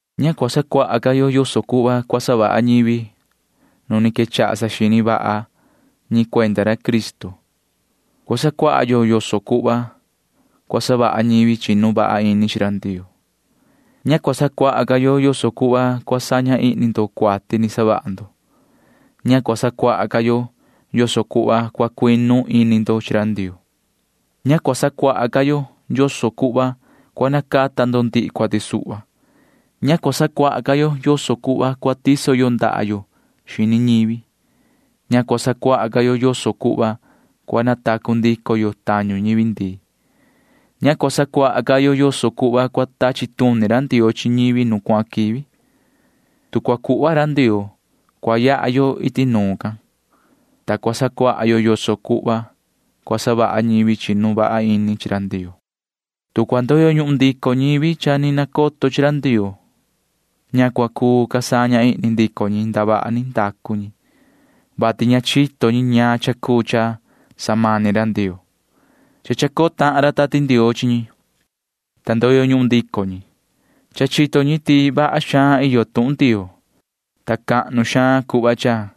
Ña cua sacuaha ca yo yoso cuhva cua savaha ñivi nu ni quechaha saxini vaha ñi cuenda ra Cristo. Cua sacuaha yo yoso cuhva cua savaha ñivi chinu vaha ini chi ra Ndioo. Ña cua sacuaha ca yo yoso cuhva cua saña ihni ndo cuati ni savaha ndo. Ña cua sacuaha ca yo yoso cuhva cua cuinu ini ndo chi ra Ndioo. Ña cua sacuaha ca yo yoso cuhva cua nacata ndo ndihi cuati suhva. Ña cua sacuaha ca yo yoso cuhva cua tiso yo ndaha yo xini ñivi. Ña cua sacuaha ca yo yoso cuhva cua natacu ndico yo tañu ñivi ndii. Ña cua sacuaha ca yo yoso cuhva cua tachi tuni ra Ndioo chi ñivi nu cuahan quivi. Tu cua cuhva ra Ndioo, cua yaha yo iti nuun ca, ta cua sacuaha yo yoso cuhva cua savaha ñivi chinu vaha ini chi ra Ndioo. Tu cua ndoyo ñuhun ndico ñivi cha ni nacoto chi ra Ndioo, ña cua cuu ca saña ihni ndico ñi ndavaha ni ndacu ñi, vati cha chito ñi ñaan cha cuu cha samani ra Ndioo. Cha chacoo tahan ra Tati Ndioo chi ñi, ta ndoyo ñuhun ndico ñi. Cha chito ñi ti vaha xaan iyo tuhun Ndioo, ta cahnu xaan cuhva cha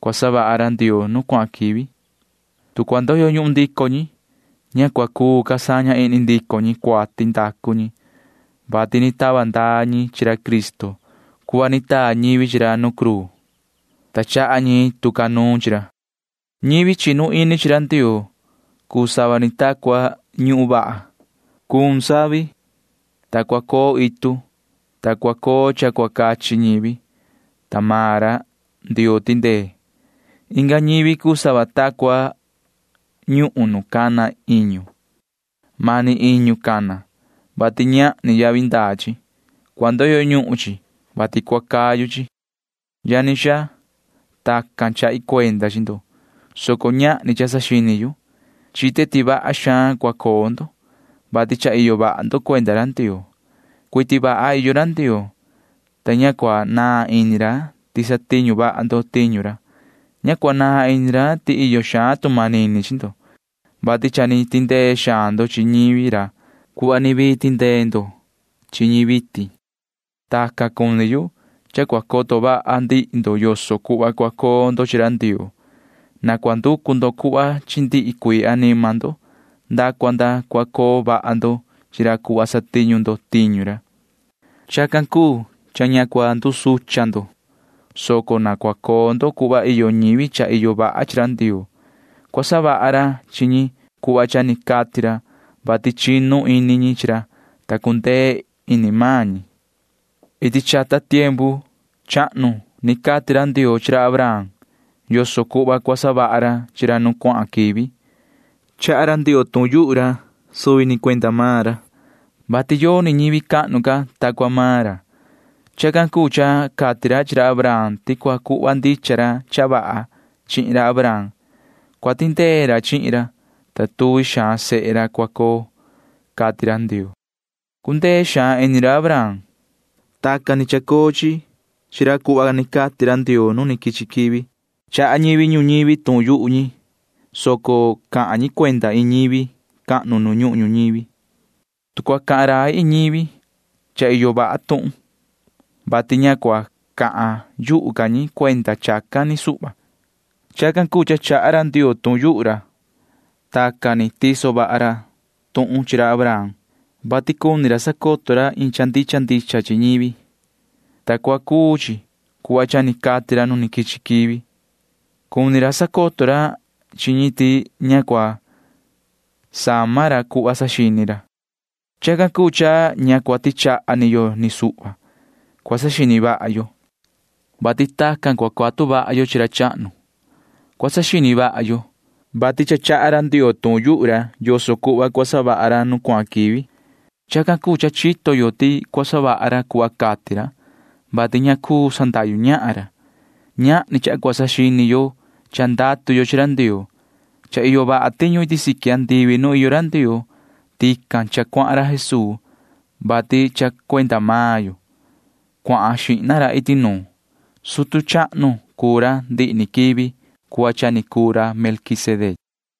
cua savaha ra Ndioo nu cuahan quivi. Tu cua ndoyo ñuhun ndico ñi, ña cua cuu ca saña ihni ndico ñi cuati ndacu ñi, vati ni tava ndaa ñi chi ra Cristo cuhva ni taa ñivi chi ra nu cruu, ta chaha ñi tu ca nuun chi ra. [Ñivi chinu ini chi Ndioo cuu sava ni ta cua ñuhun vaha.] Cuun savi, ta cua coo itu, ta cua coo cha cua cachi ñivi, ta maan ra Ndioo tindee. Inga ñivi cuu sava ta cua ñuhun nu cana iñu. Mani iñu cana, vati ñahni yavi ndaa chi. Cua ndoyo ñuhun chi, vati cua cayu chi. Yani xaa, tacan chahi cuenda chi ndo, soco ñahni cha saxini yu. Chite ti vaha xaan cua coo ndo, vati cha iyo vaha ndo cuenda ra Ndioo. Cuiti vaha iyo ra Ndioo, ta ña cua naan ini ra ti satiñu vaha ndo tiñu ra. Ña cua naan ini ra ti iyo xaan tu manini chi ndo, vati cha ni tindee xaan ndo chi ñivi ra cuhva ni vii tindee ndo chi ñi vitin. Tacan cuni yu cha cua coto vaha ndihi ndo yoso cuhva cua coo ndo chi ra Ndioo. Na cua nducu ndo cuhva chi ndihi cuii anima ndo nda cua nda cua coo vaha ndo chi ra cuhva satiñu ndo tiñu ra. Chacan cuu cha ña cua ndusucha ndo, soco na cua coo ndo cuhva iyo ñivi cha iyo vaha chi ra Ndioo. Cua savaha ra chi ñi cuhva cha ni cati ra, vati chinu ini ñi chi ra, ta cundee ini maan ñi. Iti chata tiempu chahnu ni cati ra Ndioo chi ra Abraham yoso cuhva cua savaha ra chi ra nu cuahan quivi. Cahan rai ra Ndioo tuhun can suvi ni cuenda maan ra, vati yoni ñivi cahnu ca ta cua maan ra. Chacan cuu cha cati ra chi ra Abraham ti cua cuhva ndicha ra cha vaha chihin ra Abraham. Cua tindee ra chihin ra, ta tuvi xaan sehe ra cua coo, cati ra Ndioo. Cundee xaan ini ra Abraham. Tacan ni chacoo chi chi ra cuhva ni cati ra Ndioo nu quichi quivi. Cahan rai ñivi ñuñivi, soco cahan rai ñi cuenda iin ñivi cahnu nu ñuhun ñuñivi. Tu cua cahan rai iin ñivi, cha iyo vaha tuhun, vati ña cua cahan yuhu ca ñi cuenda chacan ni suhva. Chacan cuu cha cahan rai ra Ndioo. Tacan ni tiso vaha ra tuhun chi ra Abraham, vati cuni ra sacoto ra iin cha ndicha ndicha chi ñivi, ta cua cuu chi cuhva cha ni cati ra nu quichi quivi. Cuni ra sacoto ra chi ñi ti ña cua sama ra cuhva saxini ra. Chacan cuu cha ña cua tichaha ni yo ni suhva. Cua saxini vaha yo, vati tacan cua cuatu vaha yo chi ra chahnu. Cua saxini vaha yo, vati cha cahan rai ra Ndioo yoso cuhva cua savaha ra nu cuahan quivi. Chacan cuu cha chito yo ti cua savaha ra cuhva cati ra, vati ña cuu sandahyu ñahan ra. Ñahni cha cua saxini yo cha ndatu yo chi ra Ndioo. Cha iyo vaha tiñu iti siqui andivi nu iyo ra Ndioo. Tican cha cuahan ra Jesuu, vati cha cuenda maan yo cuahan xihna ra iti nuun. Sutu chahnu cuu ra ndihi ni quivi cuhva cha ni cuu ra Melquisedec.